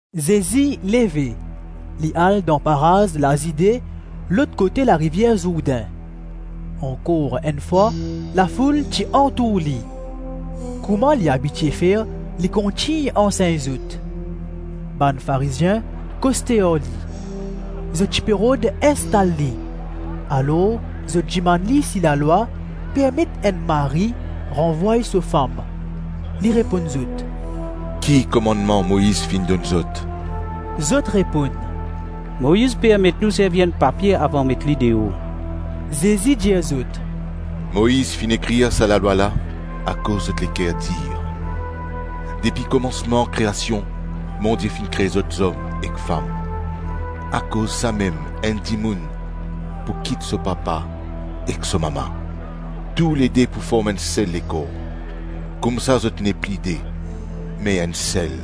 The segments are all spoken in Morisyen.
Zezi leve, li al dan paraz Lazide, lot kote larivier Zourdin. Ankor enn fwa, lafoul ti antour li. Kouma li abitie fer, li kontign ansegn zot. Bann Farizien koste ar li. Zot ti pe rod instal li, alor zot dimann li si lalwa permet enn mari ranvway so fam. Li reponn zot, “Ki komannman Moiz finn donn zot?” Zot reponn, “Moiz permet nou servi enn papie avan met li deor.” Zezi dir zot, “Moiz finn ekrir sa lalwa la akoz zot leker dir. Depi komansman kreasion, Bondie finn kre zot zom ek fam. Akoz samem enn dimoun pou kit so papa ek so mama. Toulede pou form enn sel lekor; koumsa zot nepli de, me enn sel.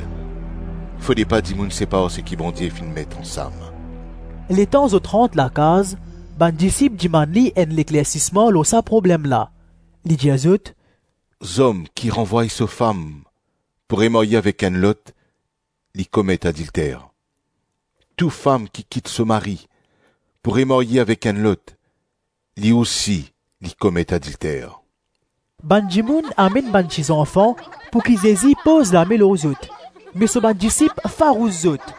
Fode pa dimoun separ seki Bondie finn met ansam.” Letan zot rant lakaz, bann disip dimann li enn leklersisman lor sa problem la. Li dir zot, “Zom ki ranvway so fam pou remarye avek enn lot, li komet adilter. Tou fam ki kit so mari pou remarye avek enn lot, li ousi, li komet adilter.” Bann dimoun amenn bann tizanfan pouki Zezi poz lame lor zot me so bann disip farous zot.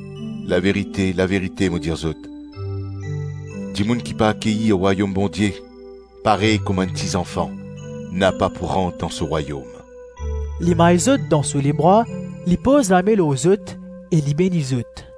Laverite, laverite mo dir zot, dimoun ki pa akeyir Rwayom Bondie parey kouma enn ti zanfan, napa pou rant dan so Rwayom.” Li may zot dan so lebra, li poz lame lor zot, e li beni zot.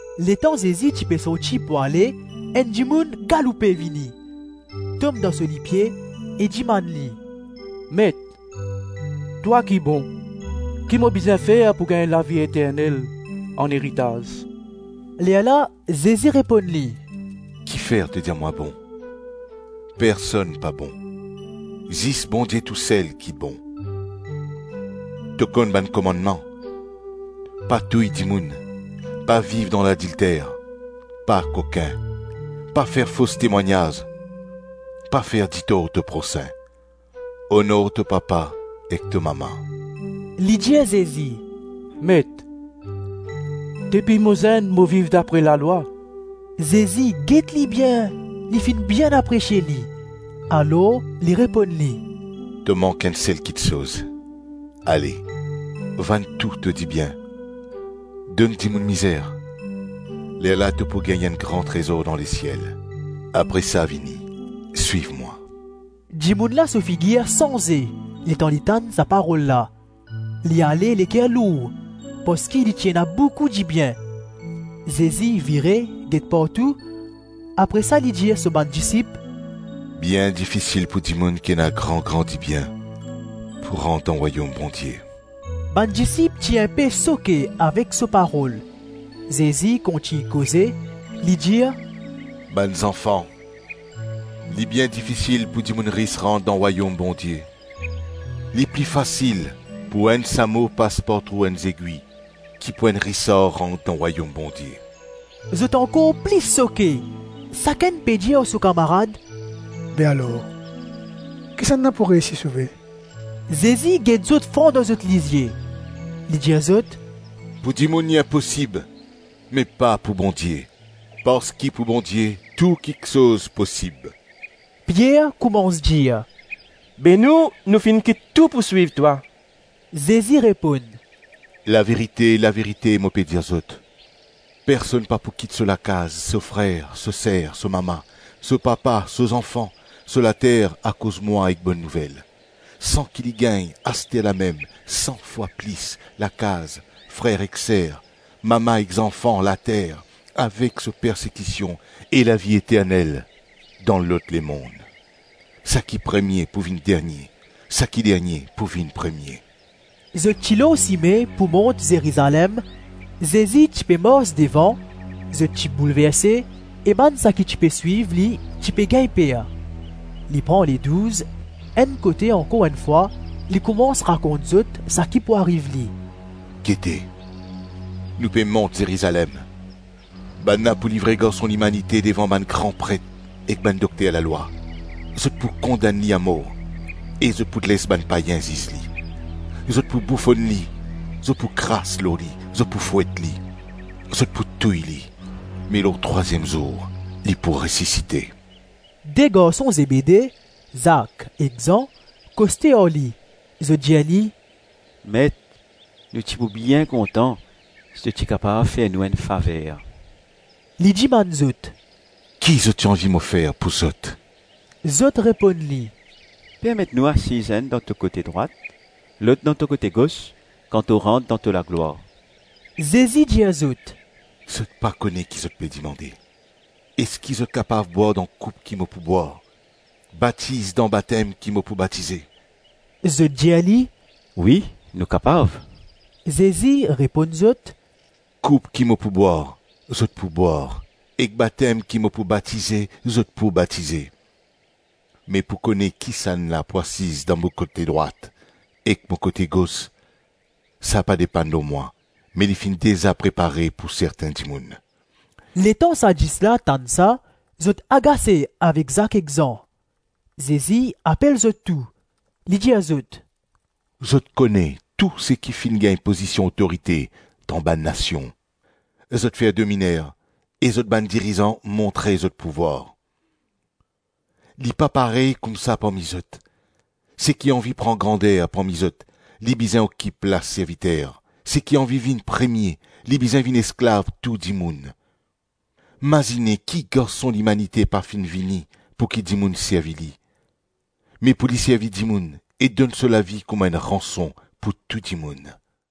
Letan Zezi ti pe sorti pou ale, enn dimoun galoupe, vini, tom dan so lipie e dimann li, “Met, twa ki bon, ki mo bizin fer pou gagn lavi eternel aneritaz?” Lerla Zezi reponn li, “Kifer to dir mwa bon? Personn pa bon, zis Bondie tousel ki bon. To konn bann komannman: pa touy dimoun, pa viv dan ladilter, pa kokin, pa fer fos temwagnaz, pa fer ditor to prosin, onor to papa ek to mama.” Li dir Zezi, “Met, depi mo zenn mo viv dapre lalwa.” Zezi get li bien, li finn bien apresie li; alor li reponn li, “To mank enn sel kiksoz: ale, vann tou to dibien, donn dimoun mizer, lerla to pou gagn enn gran trezor dan lesiel, apre sa vini, swiv mwa.” Dimoun la so figir sanze letan li tann sa parol la, li ale leker lour parski li ti ena boukou dibien. Zezi vire, get partou, apre sa li dir so bann disip, “Bien difisil pou dimoun ki ena gran-gran dibien pou rant dan Rwayom Bondie.” Bann disip ti inpe soke avek so parol; Zezi kontign koze, li dir, “Bann zanfan, li bien difisil pou dimoun ris rant dan Rwayom Bondie; Li pli fasil pou enn samo pas par trou enn zegwi ki pou enn risar rant dan Rwayom Bondie.” Zot ankor plis soke, sakenn pe dir ar so kamarad, “Be alor, kisannla pou reysi sove?” Zezi get zot fran dan zot lizie, li dir zot, “Pou dimoun li inposib me pa pou Bondie, parski pou Bondie tou kiksoz posib.” Pier koumans dir, “Be nou, nou finn kit tou pou swiv twa.” Zezi reponn, “Laverite, laverite mo pe dir zot, personn pa pou kit so lakaz, so frer, so ser, so mama, so papa, so zanfan, so later, akoz mwa ek Bonn Nouvel, san ki li gagn, asterlamem, san fwa plis: lakaz, frer ek ser, mama ek zanfan, later, avek so persekision, e lavi eternel dan lot lemonn. Saki premie pou vinn dernie, saki dernie pou vinn premie.” Zot ti lor sime pou mont Zerizalem; Zezi ti pe mars devan; zot ti boulverse e bann saki ti pe swiv li ti pe gagn per. Li pran Ledouz enn kote ankor enn fwa, li koumans rakont zot saki pou ariv li. “Gete! Nou pe mont Zerizalem, bannla pou livre Garson Limanite devan bann gran pret ek bann dokter lalwa, zot pou kondann li amor e zot pou les bann payin ziz li. Zot pou boufonn li, zot pou kras lor li, zot pou fwet li, zot pou touy li, me lor trwaziem zour li pou resisite.” De garson Zebede, Zak ek Zan, koste ar li, zot dir li, “Met, nou ti pou bien kontan si to ti kapav fer nou enn faver.” Li dimann zot, “Ki zot ti anvi mo fer pou zot?” Zot reponn li, “Permet nou asiz enn dan to kote drwat, lot dan to kote gos kan to rant dan to laglwar.” Zezi dir zot, “Zot pa kone ki zot pe dimande. Eski zot kapav bwar dan koup ki mo pou bwar, batiz dan batem ki mo pou batize?” Zot dir li, “Wi nou kapav.” Zezi reponn zot, “Koup ki mo pou bwar, zot pou bwar ek batem ki mo pou batize, zot pou batize. Me pou kone kisannla pou asiz dan mo kote drwat ek mo kote gos, sa pa depann lor mwa me li finn deza prepare pou sertin dimoun.” Letan sa dis la tann sa, zot agase avek Zak ek Zan. Zezi apel zot tou, li dir zot, “Zot kone tou seki finn gagn pozision otorite dan bann nasion, zot fer dominer e zot bann dirizan montre zot pouvwar. Li pa parey koumsa parmi zot. Seki anvi pran grander parmi zot, li bizin okip plas serviter Seki anvi vinn premie, li bizin vinn esklav tou dimoun. Mazine ki Garson Limanite pa finn vini pouki dimoun servi li, me pou li servi dimoun e donn so lavi kouma enn ranson pou tou dimoun.”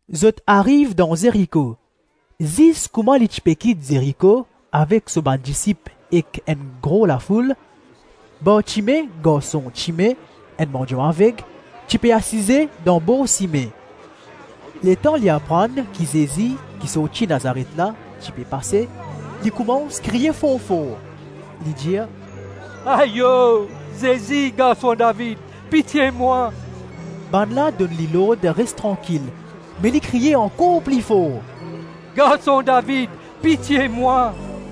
Zot ariv dan Zeriko; zis kouma li ti pe kit Zeriko avek so bann disip ek enn gro lafoul, Bartime, garson Time, enn mandian aveg, ti pe asize dan bor sime. Letan li aprann ki Zezi ki sorti Nazaret la ti pe pase, li koumans kriye for-for, li dir, “Ayo, Zezi, Garson David, pitie mwa.” Bannla donn li lord res trankil, me li kriye ankor pli for, “Garson David, pitie mwa.”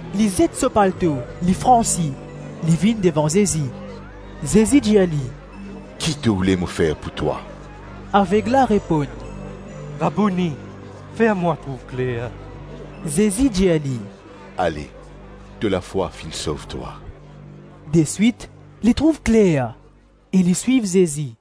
Li zet so palto, li fransi, li vinn devan Zezi. Zezi dir li, “Ki to oule mo fer pou twa?” Aveg la reponn, “Rabouni, fer mwa trouv kler.” Zezi dir li, “Ale, to lafwa finn sov twa.” Deswit li trouv kler e li swiv Zezi.